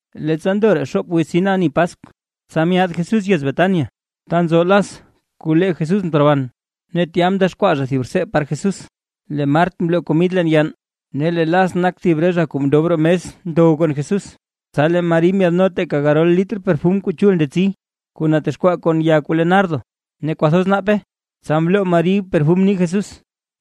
Leettsa ndoraa xoop wiz tsin ani Paskw, tsa myaad Jesús yez Betania ta nzo Las kuu lee Jesús mteroban. Ne tya mdexkwaa zha thib rtsee par Jesús, lee Mart mloo komid leen yann, ne lee Las nak thib re zha kuu mndob roo mes ndow kon Jesús. Tsa lee Mari ndyaadno teeka garol litr perfum kuu chul ndetsi, kuu natexkwaa kon ya kuu le nardo ne kwathoz naape, tsa mloo Mari perfum nii Jesús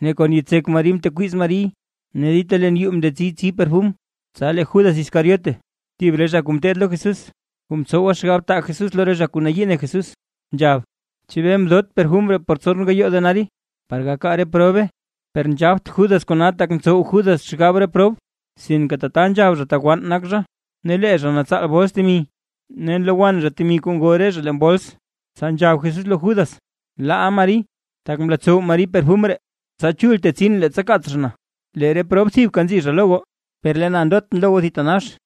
ne kon yitsek Mari mtekwiiz Mariy. Ne dita leen yuu mndetsii tsii perfum. Tsa lee Judas Iscariote, thib re zha kuu ngeteed lo Jesús, kuu mtsowa xgab taa Jesús lo re zha kuu nayii ne Jesús, nzhab: ―¿Chebee mdot perfum ree por tson gayoo denario, par gakaa re probe? Per nzhabt Judas kona tak ntsow Judas xgab re prob, sinke tata nzhab zha tak wann nak zha, ne lee zha natsaal bols temi, ne nlowann zha temi kuu ngoo re zha leen bols. Tsa nzhab Jesús lo Judas: ―Laaʼa Mari, tak mlotsow Mari perfum ree, tsa chul tetsin leettsa kaats zha na. Lee re prob thibka nzi zha lo goo, per lee na ndotʼn lo goo thitanax.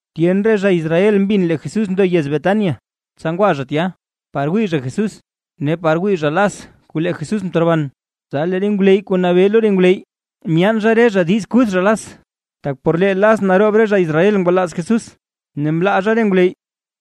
Tyen re zha Israel mbin lee Jesús ndo yez Betania, tsa ngwa zha tya, par wii zha Jesús ne par wii zha Las kuu lee Jesús mteroban. Tsa lee re ngwleyy kuu nabee lo re ngwleyy myaan zha re zha diiz kuth zha Las, tak por lee Las naroob re zha Israel ngwalaaz Jesús ne mlaa zha re ngwleyy.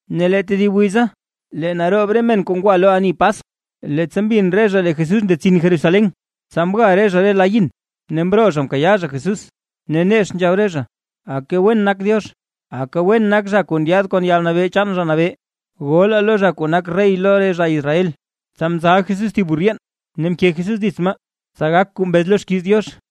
Ne lee tedib wiza, lee naroob re men kuu ngwa lo ani Paskw, leettsa mbin re zha lee Jesús ndetsin Jerusalén, tsa mga re zha la yin, ne mroo zha mkayaa zha Jesús, ne nex nzhab re zha: ―¡Aka wen nak Diox! ¡Aka wen nak zha kuu ndyaad kon yalnabee chaan Zha Nabee! ¡Golaa lo zha kuu nak rey lo re zha Israel! Tsa mzal Jesús thib burr yeen ne mke Jesús dits maa, tsa gak kuu mbez lo xkiiz Diox: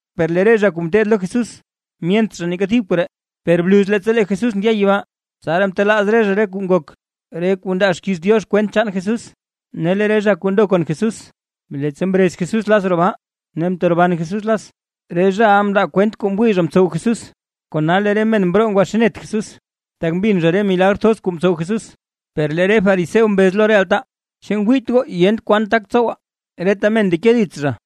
Per lee re zha kuu ngeteed lo Jesús, myent zha neeka thib re koree, per bluz leettsa lee Jesús ndya yibaa, tsaraa mtelaaz re zha re kuu ngok, re kuu ndaa xkiiz Diox kwent chaan Jesús. Ne lee re zha kuu ndo kon Jesús, leettsa mrez Jesús Las roo baa, ne mteroban Jesús Las, re zhaʼa mndaa kwent kuu mwii zha mtsow Jesús. Kona lee re men mroo ngwaxiinet Jesús, tak mbin zha re milagr thoz kuu mtsow Jesús. Per lee re fariseo mbez lo re altaa: ―¿Chu ngwiit goo yent kwan tak tsowaa? Reta men ndeke dits zha.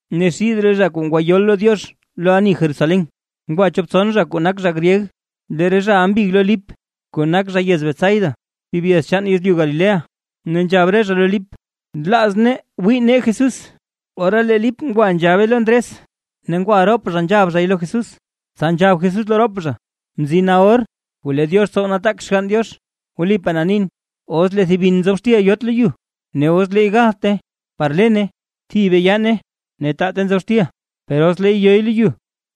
Ne xid re zha kuu ngwayol lo Diox lo ani yez Jerusalén, ngwa chop tson zha kuu nak zha gryeg. Lee re zhaʼa mbig lo Lip, kuu nak zha yez Betsaida, thib yez chaan yezlyu Galilea, ne nzhab re zha lo Lip: ―Nlaaz nee wii nee Jesús. Ora lee Lip ngwa nzhabe lo Ndres ne ngwa rop zha nzhab zhay lo Jesús. Tsa nzhab Jesús lo rop zha: ―Mzina or kuu lee Diox tsow nataak xgann. Wlipaa na nin, os lee thib bin nzob xtil yot lo yu ne os leey gathte par lene, thibe yaane ne taate nzob xtil, per os leey yoy lo yu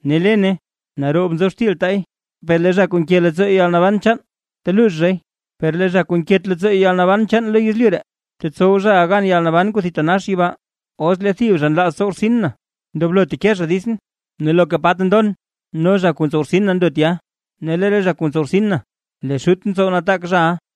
ne lene naroob nzob xtil taay. Lee zha kuu nke leettsoo yalnaban chaan teluux zhay, per lee zha kuu nket leettsoo yalnaban chaan lo yezlyu ree, tetsow zhaʼa gan yalnaban kuu thitanax yibaa. Os lee thib zha nlaaz tsow rtsin na, ndoblo teke zha ditsʼn, ne loka pa ta ndon no zha kuu ntsow rtsin na ndo tya. Ne lee re zha kuu ntsow rtsin na, lee Xutʼn tsow nataak zhaʼa.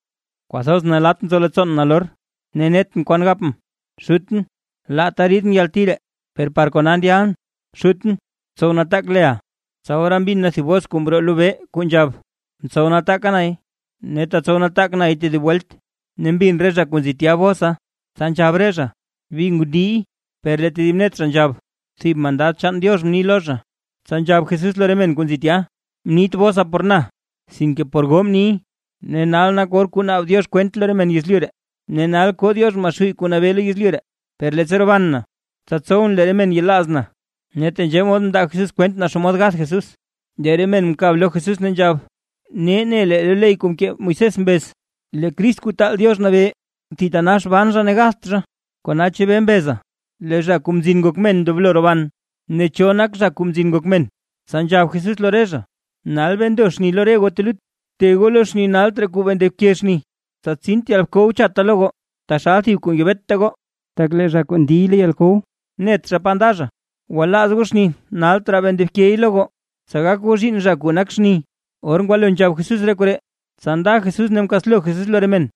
’¡Kwathoz nalatt nzo leettsoon nalor! Ne netʼn kwan gapʼn: “Xutʼn, laata riidʼn yalti ree”. ¡Per par kona ndyalʼn! Xutʼn, btsow nataak leʼa. Tsa ora mbin na thib bos kuu mroo lobee, kuu nzhab: ―Mtsow nataaka nay, ne tetsow nataak nay tedib welt. Ne mbin re zha kuu nzi tya bosa, tsa nzhab re zha, bi ngundiiy, per lee tedib net zha nzhab: ―Thib mandad chaan Diox mni lo zha. Tsa nzhab Jesús lo re men kuu nzi tya: ―Mniit bosa por na, sinke por goo mniy. Ne nal nak or kuu naab Diox kwent lo re men yezlyu ree, ne nal koo Diox Maxuuy kuu nabee lo yezlyu ree. Per leettsa roban na, tsa tsowʼn lee re men yelaaz na. Ne tenzhee mod mndaa Jesús kwent naa xomod gath Jesús. Lee re men mkab lo Jesús ne nzhab: ―Nee ne lee lo ley kuu mkee Moisés mbez, lee Crist Kuu Taal Diox Nabee, thitanax ban zha ne gatht zha. ¿Kona chebee mbeza lee Zha Kuu Mzin Ngok Men ndoblo roban? Ne ¿cho nak Zha Kuu Mzin Ngok Men? Tsa nzhab Jesús lo re zha: ―Nal bee ndo xni lo re goo telut. Bte goo lo xni nalt raa kuu bee ndobke xni, tsa tsint yalkow chatta lo goo taxal thib kuu ngebeta goo, tak lee zha kuu ndiy lo yalkow, net zha pa nda zha. Gwalaaz goo xni nalt raa bee ndobkey lo goo, tsa gak goo zhiinn zha kuu nak xni. Or ngwalo nzhab Jesús re koree, tsa nda Jesús ne mkaslo Jesús lo re men.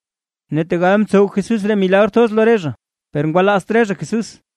Ne tegal mtsow Jesús re milagr thoz lo re zha, per ngwalaazt re zha Jesús,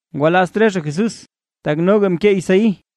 Ngwalaazt re zha Jesús, tak noga mkee Isaí: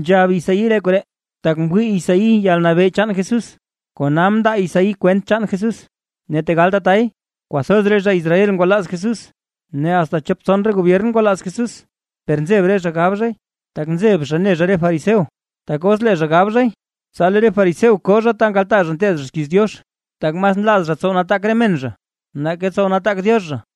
Nzhab Isaí re koree, tak mwii Isaí yalnabee chaan Jesús, kona mndaa Isaí kwent chaan Jesús. Ne tegal tatay, kwathoz re zha Israel ngwalaaz Jesús, ne asta chop tson re gobyern ngwalaaz Jesús, per nzeb re zha gab zhay, tak nzeb zha ne zha re fariseo, tak os lee zha gab zhay, tsa lee re fariseo koo zha ta nkaltaa re zha nteed zha xkiiz Diox. Tak mas nlaaz zha tsow nataak re men zha, nake tsow nataak Diox zha.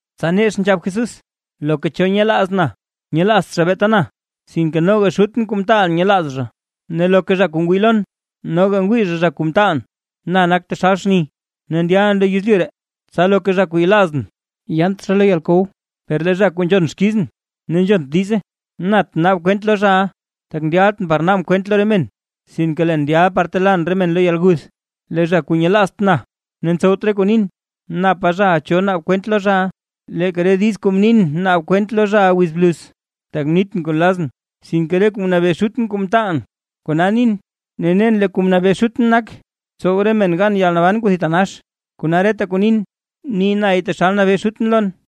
Tsa nex nzhab Jesús: ―Loka cho nyelaaz na, nyelaazt zha beeta na, sinke noga Xutʼn kuu mtaalʼn nyelaaz zha. Ne loka zha kuu ngwii lon noga ngwii zha zha kuu mtaalʼn. Na nak taxal xni, ne ndyalʼn lo yezlyu ree, tsa loka zha kuu yelaaz na yaant lo yalkow. Per lee zha kuu nzhon xkizʼn, ne nzhont diize, nat naab kwent lo zha, tak ndyaltʼn par naabʼn kwent lo re men, sinke leen ndyalʼn par telaan re men lo yalguth. Lee zha kuu nyelaazt na ne ntsowt re kuu nin, napa zhaʼa cho naab kwent lo zha, leeka re diiz kuu mnin naab kwent lo zha wiz bluz. Tak mnitʼn kuu nlazʼn; sinke re kuu mnabee Xutʼn kuu mtaalʼn, kona mnin. Ne, nen lee kuu mnabee Xutʼn nak, tsow re men gan yalnaban kuu thitanax. Kona reta kuu nin, ni nay taxal mnabee Xutʼn lon.